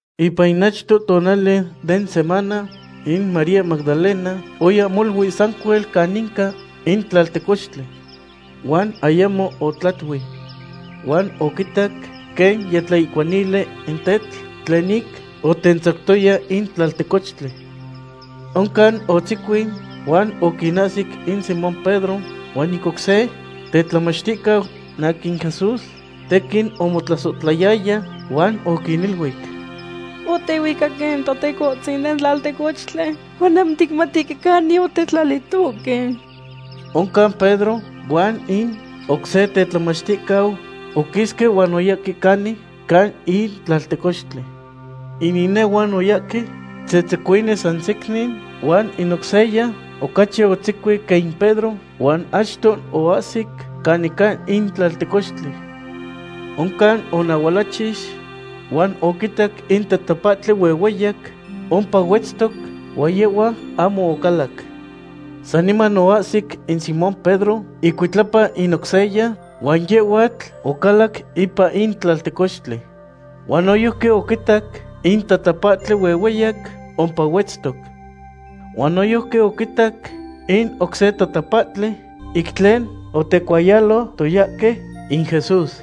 Ipan in achto tonali den semana, in María Magdalena oya molui sancuel caninca in tlaltecochtli. Huan ayamo otlatui. Huan oquitac quen yitlaihcuanili in tetl tlen ic otentzactoya in tlaltecochtli. Oncan otzecuin huan oquinahsi in Simón Pedro huan in oc se tetlamachticau in aquin Jesús tequin omotlasohtlayaya, huan oquiniluic: ―Otehuicaque in Totecohtzin den tlaltecochtli, huan ahmo ticmatihque canin otetlalitohque. Oncan Pedro huan in oc se tetlamachticau oquisque huan oyahque canin ca in tlaltecochtli. In inehuan oyahque tzetzecuini san secnin, huan in oc seya ocachi otzecuin quen in Pedro huan achto oahsic canin ca in tlaltecochtli. Oncan onahualachix, huan oquitac in tatapahtli huehueyac ompa huetztoc, huan yehhua ahmo ocalac. Saniman oahsic in Simón Pedro icuitlapa in oc seya, huan yehhuatl ocalac ipan in tlaltecochtli. Huan noyojqui oquitac in tatapahtli huehueyac ompa huetztoc. Huan noyojqui oquitac in oc se tatapahtli ic tlen otecuayalotoyahque in Jesús.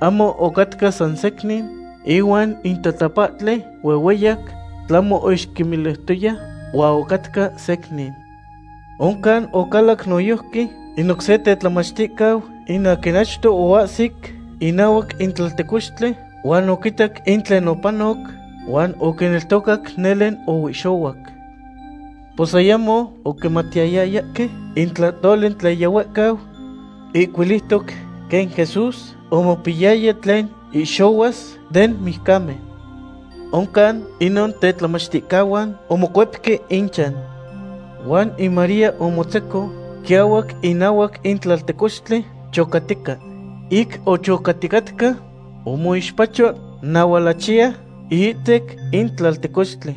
Ahmo ocatca san secnin ihuan in tatapahtli huehueyac, tlahmo oixquimiliutoya huan ocatca secnin. Oncan ocalac noyojqui in oc se tetlamachticau in aquin achto oahsic inahuac in tlaltecochtli, huan oquitac in tlen opanoc, huan oquineltocac nele oihxohuac. Pos ayamo oquimatiyayahque in tlahtoli tlen yihuehcau ihcuiliutoc quen Jesús omopiyaya tlen ihxohuas den mijcamen. Oncan inon tetlamachticahuan omocuepque inchan. Huan in María omotzeco quiahuac inahuac in tlaltecochtli, chocatica. Ic ochocaticatca, omoixpacho nahualachiya iihtec in tlaltecochtli.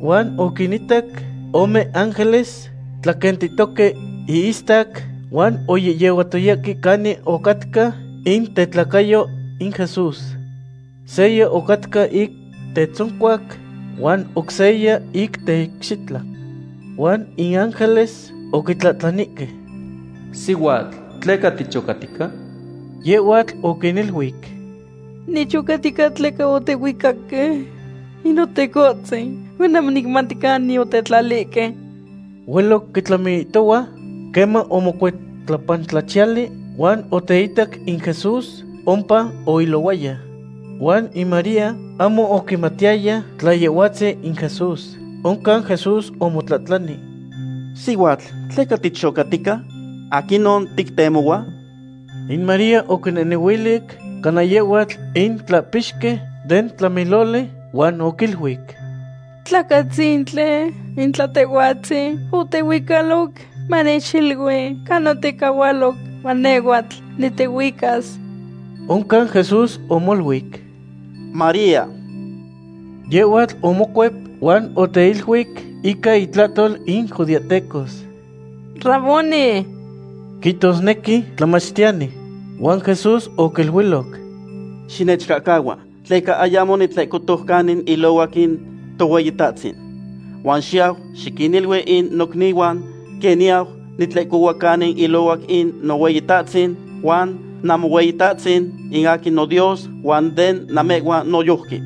Huan oquinitac ome ángeles tlaquentitoque ihistac, huan yehyehuatoque canin ocatca in tetlacayo in Jesús. Seya ocatca ic tetzoncuac huan oc seya ic teicxitla. Huan in ángeles oquitlahtlanihque: ―Sihuatl, ¿tleca tichocatica? Yehhuatl oquiniluic: ―Nichocatica tleca otehuicaque in Notecohtzin, huan ahmo nicmati canin otetlalihque. Hueloc quitlamiihtohua, queman omocuetlapantlachiyali huan oteitac in Jesús ompa oilohuaya. Huan in María ahmo oquimatiyaya tla Yehhuatzin in Jesús. Oncan Jesús omotlahtlani: ―Sihuatl, ¿tleca tichocatica? ¿Aquinon tictemohua? In María oquinehnehuilic cana yehhuatl in tlahpixqui den tlamiloli, huan oquiluic: ―Tlacatzintli, in tla tehhuatzin otehuicaloc, manechilui canin otecahualo, huan nehhuatl nitehuicas. Oncan Jesús omoluic: ―¡María! Yehhuatl omocuep huan oteiluic ica intlahtol in judeahtecos: ―¡Raboni! ―quihtosnequi, Tlamachtiyani. Huan Jesús oquiluiloc: ―Xinechcahcahua, tleca ayamo nitlehcotoc canin ilohuac in Tohueyitahtzin. Huan xiyau xiquinilui in nocnihuan, quen niyau nitlehcohua canin ilohuac in Nohueyitahtzin huan Namohueyitahtzin, in aquin noDios huan den namehhuan noyojqui.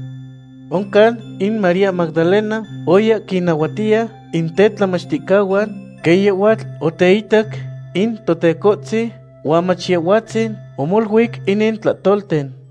Oncan in María Magdalena oya quinnahuatiya in tetlamachticahuan quen yehhuatl oteitac in Totecohtzin huan mach Yehhuatzin omoluic inin tlahtolten.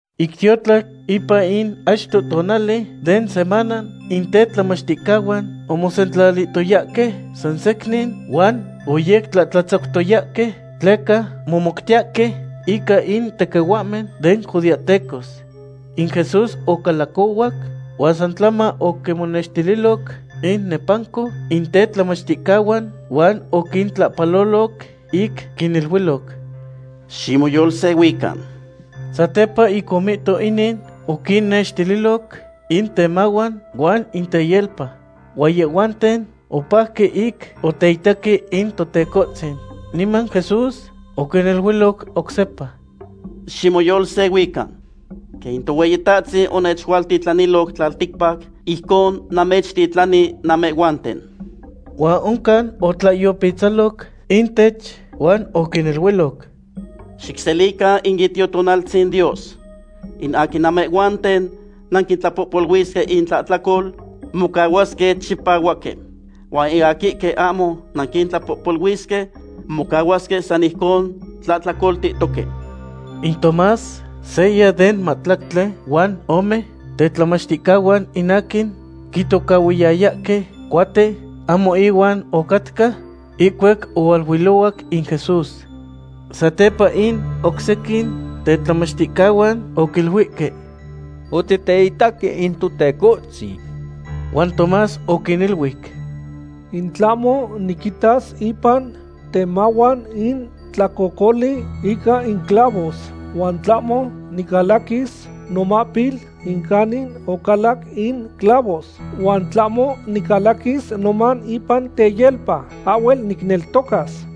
Ic tiotlac ipan in achto tonali den semana, in tetlamachticahuan omosentlalihtoyahque san secnin huan oyectlahtlatzactoyahque, tleca momoutiyahque ica in tequihuahmen den judeahtecos. In Jesús ocalacohuac huan san tlama oquimonextililoc innepanco in tetlamachticahuan, huan oquintlahpaloloc ic quiniluiloc: ―¡Ximoyolsehuican! Satepa ic omihto inin, oquinnextililoc in temahuan huan in teyelpa. Huan yehhuanten opajque ic oteitaque in Totecohtzin. Niman Jesús oquiniluiloc oc sepa: ―Ximoyolsehuican. Quen in Tohueyitahtzin onechualtitlaniloc tlalticpac, ijcon namechtitlani namehhuanten. Huan oncan otlaihyopitzaloc intech huan oquiniluiloc: ―Xicselican in Itiotonaltzin Dios. In aquin namehhuanten nanquitlapohpoluisque intlahtlacol, mocahuasque chipahuaque. Huan in aquihque ahmo nanquintlapohpoluisque, mocahuasque san ijcon tlahtlacoltihtoque. In Tomás, seya den mahtlactli huan ome tetlamachticahuan in aquin quitocahhuiyahque Cuate, ahmo inuan ocatca ihcuac ohualuilohuac in Jesús. Satepa in oc sequin tetlamachticahuan oquiluihque: ―Otiteitaque in Totecohtzin. Huan Tomás oquiniluic: ―In tlahmo niquitas ipan temahuan in tlacocoli ica in clavos, huan tlahmo nicalaquilis nomahpil in canin ocalac in clavos, huan tlahmo nicalaquis noman ipan teyelpa, ahhuel nicneltocas.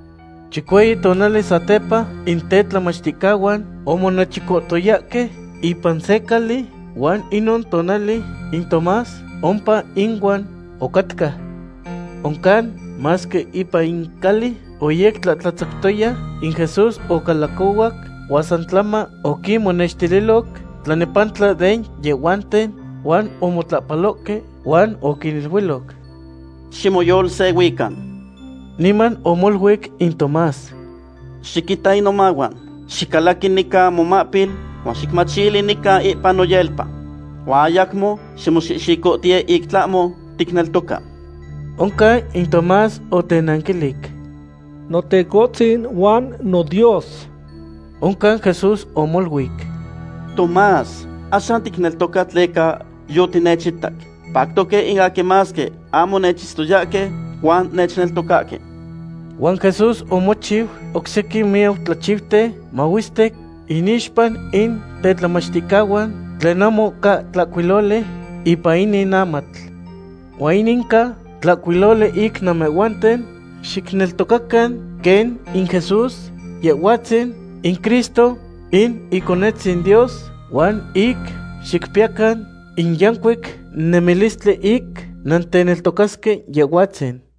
Chicueyi tonali satepa, in tetlamachticahuan omonechicohtoyahque ipan se cali, huan inon tonali in Tomás ompa inuan ocatca. Oncan, masque ipan in cali oyectlahtlatzactoya, in Jesús ocalacohuac, huan san tlama oquimonehnextililoc tlanepantla den yehhuanten huan omotlahpalohque huan oquiniluiloc: ―¡Ximoyolsehuican! Niman omoluic in Tomás: ―Xiquita in nomahuan; xicalaqui nican momahpil, huan xicmachili nica ipan noyelpa. Huan ayacmo ximoxicohtiye in tlahmo ticneltoca. Oncan in Tomás otenanquilic: ―¡Notecohtzin huan noDios! Oncan Jesús omoluic: ―Tomás, axan ticneltoca tleca yotinechitac. Pactoque in aquin masque ahmo nechitztoyahque, huan nechneltocasque. Huan Jesús omochiu oc sequin miyac tlachiuten mahuestic inixpa in tetlamachticahuan tlen ahmo ca tlahcuiloli ipan inin amatl. Huan inin ca tlahcuiloli ic namehhuanten xicneltocacan quen in Jesús, Yehhuatzin in Cristo in Iconetzin Dios, huan ic xicpiyacan in yancuic nemilistli ic nanteneltocasque Yehhuatzin.